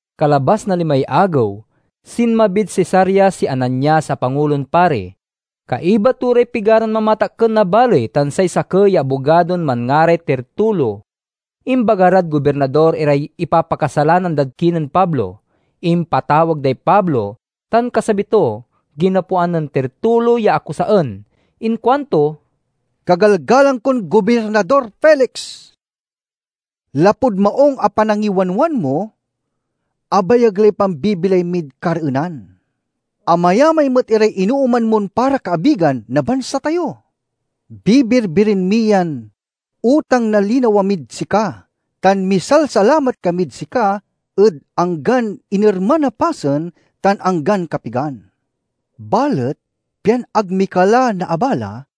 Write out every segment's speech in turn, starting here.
Kalabas na limay agew, sinmabid Cesarea si Ananias a Pangulon Pari. Kaiba to ray pigaran mamatakken na baley tan say sakey ya abogadon manngaray Tertulo. Imbaga rad gobirnador iray ipapakasalanan dad kinen Pablo. Impatawag day Pablo, tan kasabi to, ginapoan nen Tertulo ya akusaen. Inkuanto, "Kagalgalang kon Gobirnador Felix! Lapud maung a panangiwanwan mo, abayag lay pambibilay mid kareenan. Amayamay met iray inooman mon para kaabigan na bansa tayo. Bibirbiren mi yan utang na linawa mid sika tan misalsalamat kamid sika ed anggan inerman a pasen tan anggan kapigan. Balet pian ag mi ka la naabala,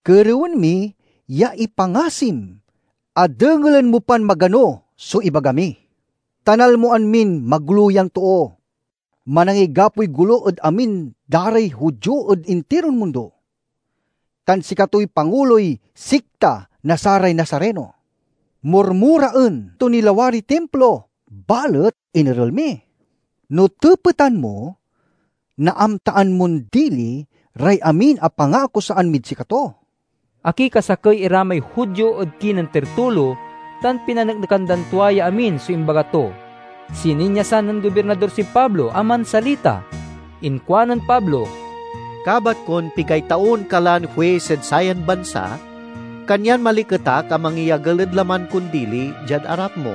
kerewen mi ya ipangasim a dengelen mo pan magano so ibaga mi. Ta nalmoan min magolo yan too. Manangigapoy golo ed amin da ray Judio ed intiron mundo, tan sikatoy panguloy sikta na saray Nazareno. Murmuraen to ni lawariy Timplo, balet inerel mi. No tepetan mo, naamtaan mon dili ray amin a pangaakusaan mid sikato." Akikasakey ira may Judio ed kinen Tertulo, tan pinaneknekan dan tua ya amin so imbaga to. Sininyasan nen Gobirnador si Pablo a mansalita. Inkuanen Pablo, "Kabat kon pigay taon ka lan huis ed sayan bansa, kanyan maliket ak a mangyagel ed laman kon dili diad arap mo.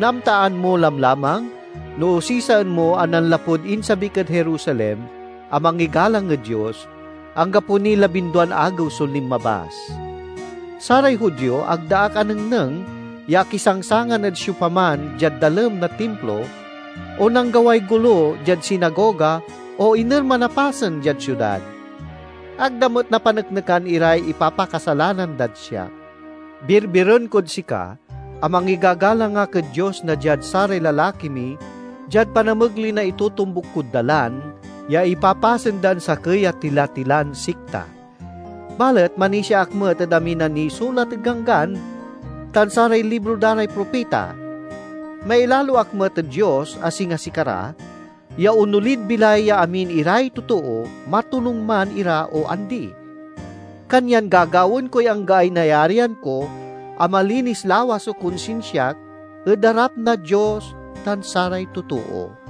Naamtaan mo lamlamang no osisaen mo a nanlapud insabik ed Jerusalem a mangigalang ed Dios, anggapo niy labinduan agew so linmabas. Saray Judio ag da ak anengneng ya akisangsangan ed siopaman diad dalem na Timplo, o nanggaway golo diad sinagoga o inerman a pasen diad siudad. Ag da met napaneknekan iray ipapakasalanan dad siak. Birbiren kod sika a mangigagalang ak ed Dios na diad saray lalaki mi diad panamegley na itotombuk kod Dalan, ya ipapasen dan sakey a tilatilan sikta. Balet manisia ak met ed amin a nisulat ed Ganggan tan saray libro da ray propita. Mailalo ak met ed Dios, a singa sikara, ya onolid bilay ya amin iray totoo, matonung man ira o andi. Kanyan gagawaen koy anggaay nayarian ko a malinis lawas so konsinsiak ed arap na Dios tan saray totoo.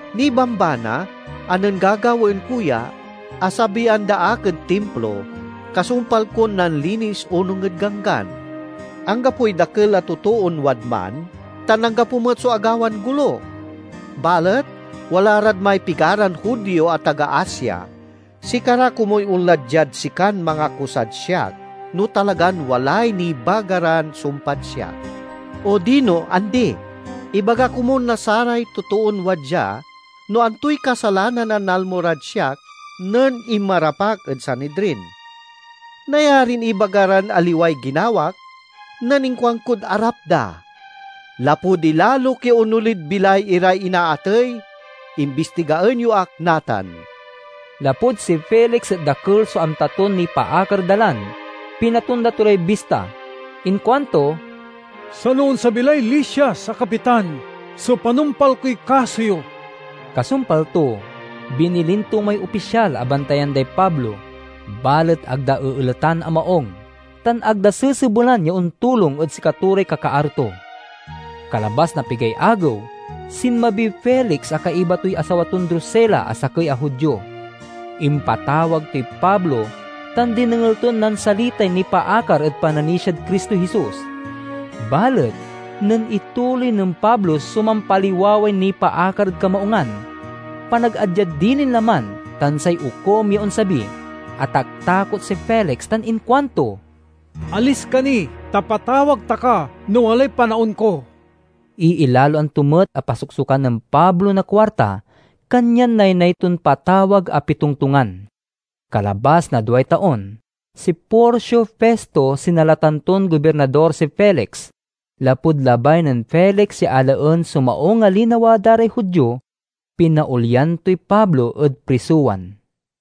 Nibambana a nen gagawaen ko ya, asabian da ak ed Timplo, kasumpal kon nanlinis onung ed Ganggan. Anggapoy dakel a totoon wadman, tan anggapo met so agawan golo. Balet wala rad may pigaran Judio a taga Asia. Sikara komuy onla diad sikan mangakusad siak, no talagan walay nibaga ran sumpad siak. Odino andi, ibaga komun na saray totoon wadya no antoy kasalanan a nalmo rad siak nen inmarap ak ed Sanidrin. Nayarin ibaga ran aliway ginawak nen inkuankod arap da, 'Lapud ilalok ya onolid bilay iray inaatey, imbistigaen yo ak natan!'" Lapud si Felix et dakel so amta ton nipaakar ed Dalan, pinatonda to lay bista. Inkuanto, "Sano onsabi lay Lisias a kapitan so panumpal koy kaso yo." Kasumpal to, binilin to may opisyal a bantayan day Pablo, balet ag da eeletan a maung, tan ag da sesebelan ya ontulong ed sikato ray kakaaro to. Kalabas na pigay agew, sinmabiy Felix a kaiba toy asawa ton Drusila a sakey a Judio. Impatawag toy Pablo tan dinengel ton nansalitay nipaakar ed pananisiad Cristo Jesus. Balet nen ituloy nen Pablo so mampaliwaway nipaakar ed kamaungan, panagadyad dilin laman, tan say okum ya onsabi, ataktakot si Felix tan inkuanto, "Alis ka ni, ta patawag ta ka no walay panaon ko." Iilaloan to met a pasoksokan nen Pablo na kuarta, kanyan naynay ton patawag a pitongtongan. Kalabas na duay taon, si Porcio Festo sinalatan ton Gobirnador si Felix. Lapud labay nen Felix ya alaen so maung a linawa da ray Judio, pinaolyan toy Pablo ed prisowan.